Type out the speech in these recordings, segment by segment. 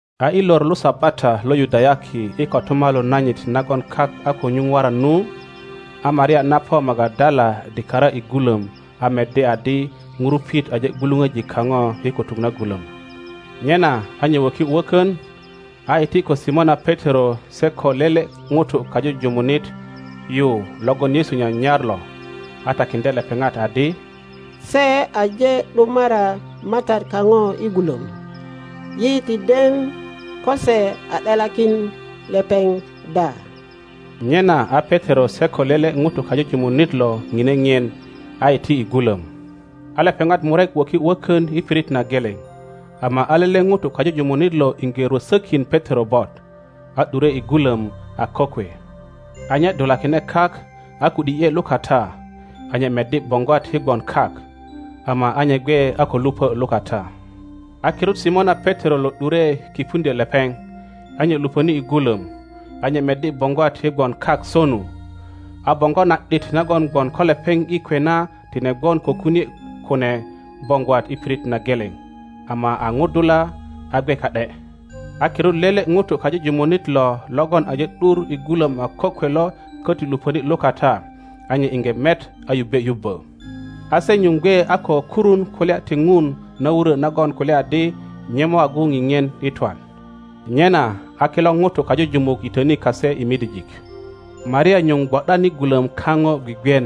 A i lor lo Sabata lo Yudayaki i kotumalu nanyit nagon kak a ko nyuŋ waran nu, a Maria na po Magadala dikara i gulöm a meddi adi ŋurupit aje gwuluŋöji kaŋo i kutuk na gulöm. Nyena a nye wöki wökön, a iti ko Simona Petero se ko lele ŋuto kajuju munit yu logon Yesu nyanyar lo, a takiŋdye lepeŋat adi, Se aje ’dumara MATAT kaŋo i gulöm. Yi ti den ko se a ’delakin lepeŋ da. Nyena a Petero se ko lele ŋuto kajujumunit lo ŋine ŋien, a iti i gulöm. A lepeŋat murek wöki wökön i pirit na geleŋ; ama a lele ŋuto kajujumunit lo iŋge rwösökin Petero bot, a ’dure i gulöm a kokwe. A nye dulakine kak a ku ’di ’ye lukata, a nye meddi boŋgwat i gwon kak; ama a nye gwe a ko lupö lukata. A kirut Simona Petero lo ’dure kipuŋdyö lepeŋ, a nye lupöni i gulom; a nye meddi boŋgwat i gwon kak sonu, a boŋgo na ’dit nagon gwon ko lepeŋ i kwe na tine gwon ko kunie kune boŋgwat i pirit na geleŋ, ama a ŋudula a gwe ka ’de. A kirut lele ŋuto kajujumunit lo logon aje ’dur i gulom a kokwe lo köti luponi lukata, a nye iŋge met a yubbe yubbö. A se nyuŋ gwe a ko kurun kulya ti Ŋun na wurö nagon kulya adi nye mo agu ŋiŋien i twan. Nyena a kilo ŋutu kajujumuk yitöni kase i midijik. Maria nyuŋ gwo ’dan i gulöm kaŋo gwigwien.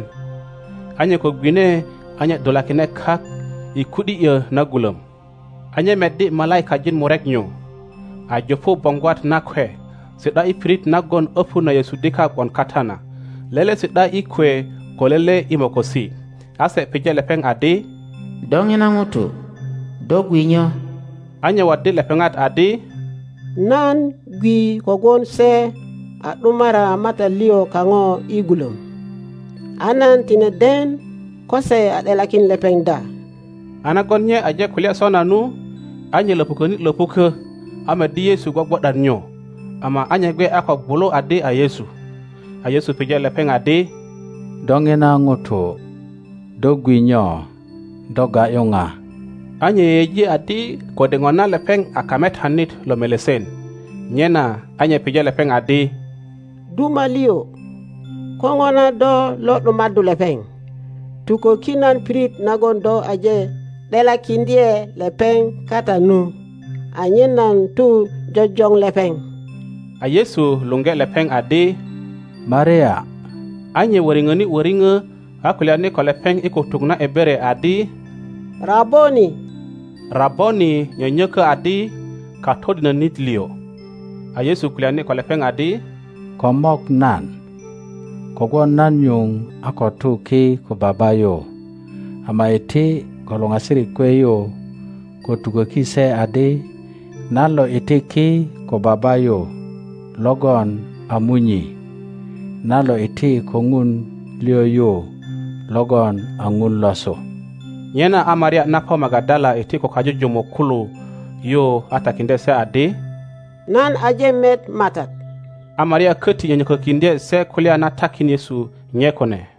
A nye ko gwine, a nye dulakine kak i ku ’di ’yö na gulöm, a nye meddi malaikajin murek nyu, a jupu boŋgwat nakwe, si ’da i pirit nagon öpu na Yesu dika gwon kata na, lele si ’da i kwe ko lele i mokosi. A se pije lepeŋ adi, Do ŋina ŋuto, do gwi nyo? A nye waddi lepeŋat adi, Nan gwi kogwon se a ’dumara MATAT liŋ kaŋo i gulöm, a nan tine den ko se a ’delakin lepeŋ da. A nagon nye aje kulya sona nu, a nye löpuköni löpukö, a meddi Yesu gwogwo ’dan nyu, am ’a a nye gwe a ko gwulu adi a Yesu. A Yesu pije lepeŋ adi, Do ŋina ŋuto, do gwi nyo? Do ga ’yu ŋa? A nye yeyeji adi kode ŋona lepeŋ a kametanit lo melesen, nyena a nye pije lepeŋ adi, Duma liŋ, ko ŋona do lo ’dumaddu lepeŋ; tuköki nan pirit nagon do aje ’delakiŋdye lepeŋ kata nu, anyen nan tu jojoŋ lepeŋ. A Yesu luŋgi lepeŋ adi, Maria! A nye wöriŋöni wöriŋö a kulyani ko lepeŋ i kutuk na Ebere adi, Raboni! (Raboni nyönyökö adi, Katodinönit liŋ.) A Yesu kulyani ko lepeŋ adi, Ko mok nan, kogwon nan nyuŋ a ko tu ki ko Baba yu; ama iti ko luŋasirik kwe yu, ko tuköki se adi, Nan lo iti ki ko Baba yu logon a Munyi. Nan lo iti ko Ŋun liŋ yu logon a Ŋun losu. Nyena a Maria na po Magadala iti ko kajujumuk kulo yu a takiŋdye se adi, Nan aje met MATAT; a Maria köti nyönyökökiŋdye se kulya na takin Yesu nye kune.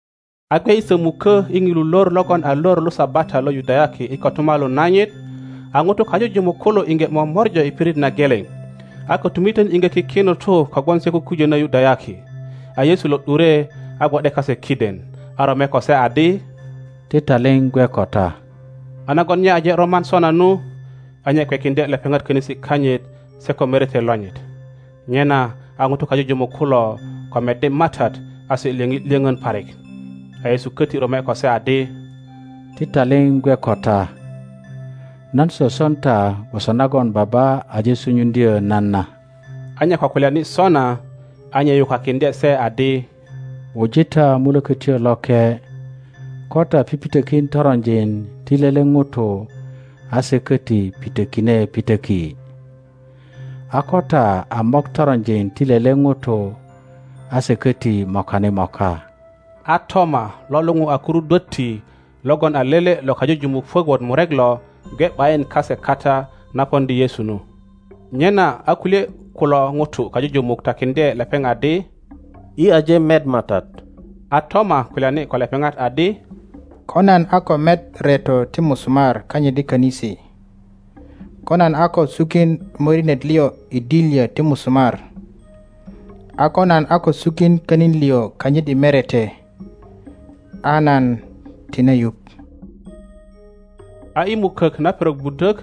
A gwe i sömukö i ŋilu lor logon a lor lo Sabata lo Yudayaki i kotumalu nanyit, a ŋutu kajujumuk kulo iŋge momorja i pirit na geleŋ, a kötumitön iŋge kiki ŋutu kogwon se kukujönö Yudayaki, a Yesu lo ’dure a gwo ’de kase kiden, a rome ko se adi, Ti taliŋ gwe ko ta. a nagon nye aje roman sona nu, a nye kwekiŋdye lepeŋat könisi kanyit se ko merete lonyit. Nyena a ŋutu kajujumuk kulo ko meddi MATAT, a se lyöŋi lyöŋön parik. A Yesu köti rome ko se adi, Ti taliŋ gwe ko ta. Nan soson ta gwoso nagon Baba aje sunyuŋdyö nan na. a nye ko kulyani sona, a nye yukakiŋdye se adi, Wuji ta Mulökötyo Loke. Ko ta pipitökin toronjin ti lele ŋuto a se köti pitökine pitöki; a ko ta a mok toronjin ti lele ŋuto a se köti mokani moka. A Toma lo luŋu a Kurudwötti, logon a lele lo kajujumuk puök wot murek lo, gwe ’bayin kase kata na poŋdi Yesu nu. Nyena a kulye kulo ŋutu kajujumuk tukökiŋdye lepeŋ adi, Yi aje met MATAT. A Toma kulyani ko lepeŋat adi, Ko nan a ko met reto ti musumar kanyit i könisi, ko nan a ko sukin morinet liŋ i dilyö ti musumar, a ko nan a ko sukin könin liŋ kanyit i merete, a nan tine yuŋ. A i mukök na perok budök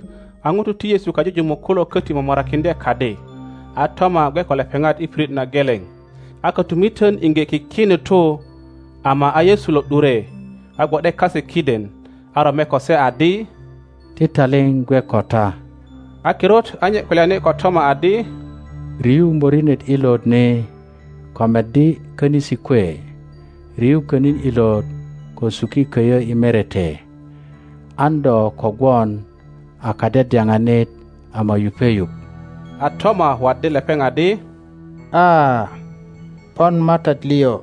a ŋutu ti Yesu kajujumuk kulo köti momorakiŋdye kadi, a Toma gwe ko lepeŋat i pirit na geleŋ. A kötumitön iŋge kiki nutu, ama a Yesu lo ’dure, a gwo ’de kase kiden, a rome ko se adi, Ti taliŋ gwe ko ta. a kirut a nye kulyani ko Toma adi, Riyu morinet ilot ni ko meddi könisi kwe; riyu könin ilot ko suki köyö i merete. An do ko gwon a kadyadyalanit ama yupe yuŋ. A Toma waddi lepeŋ adi. A, pon MATAT liŋ,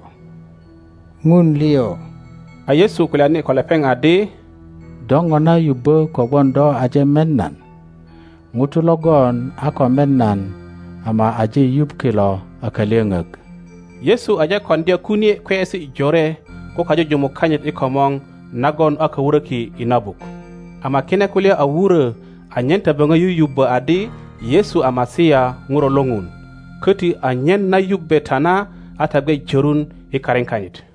Ŋun liŋ! A Yesu kulyani ko lepeŋ adi, Do ŋona yubbö kogwon do aje met nan? ŋutu logon a ko met nan ama aje yuŋ kilo a kalyöŋök. Yesu aje koŋdya kunie kweyesi jore ko kajujumuk kanyit i komor nagon a ko wuröki i na buk; ama kine kulya a wurö anyen ta böŋo yuyubbö adi Yesu a Masia Ŋuro lo Ŋun, koti anyen na yubbe ta na a ta gwe jörun i karin kanyit.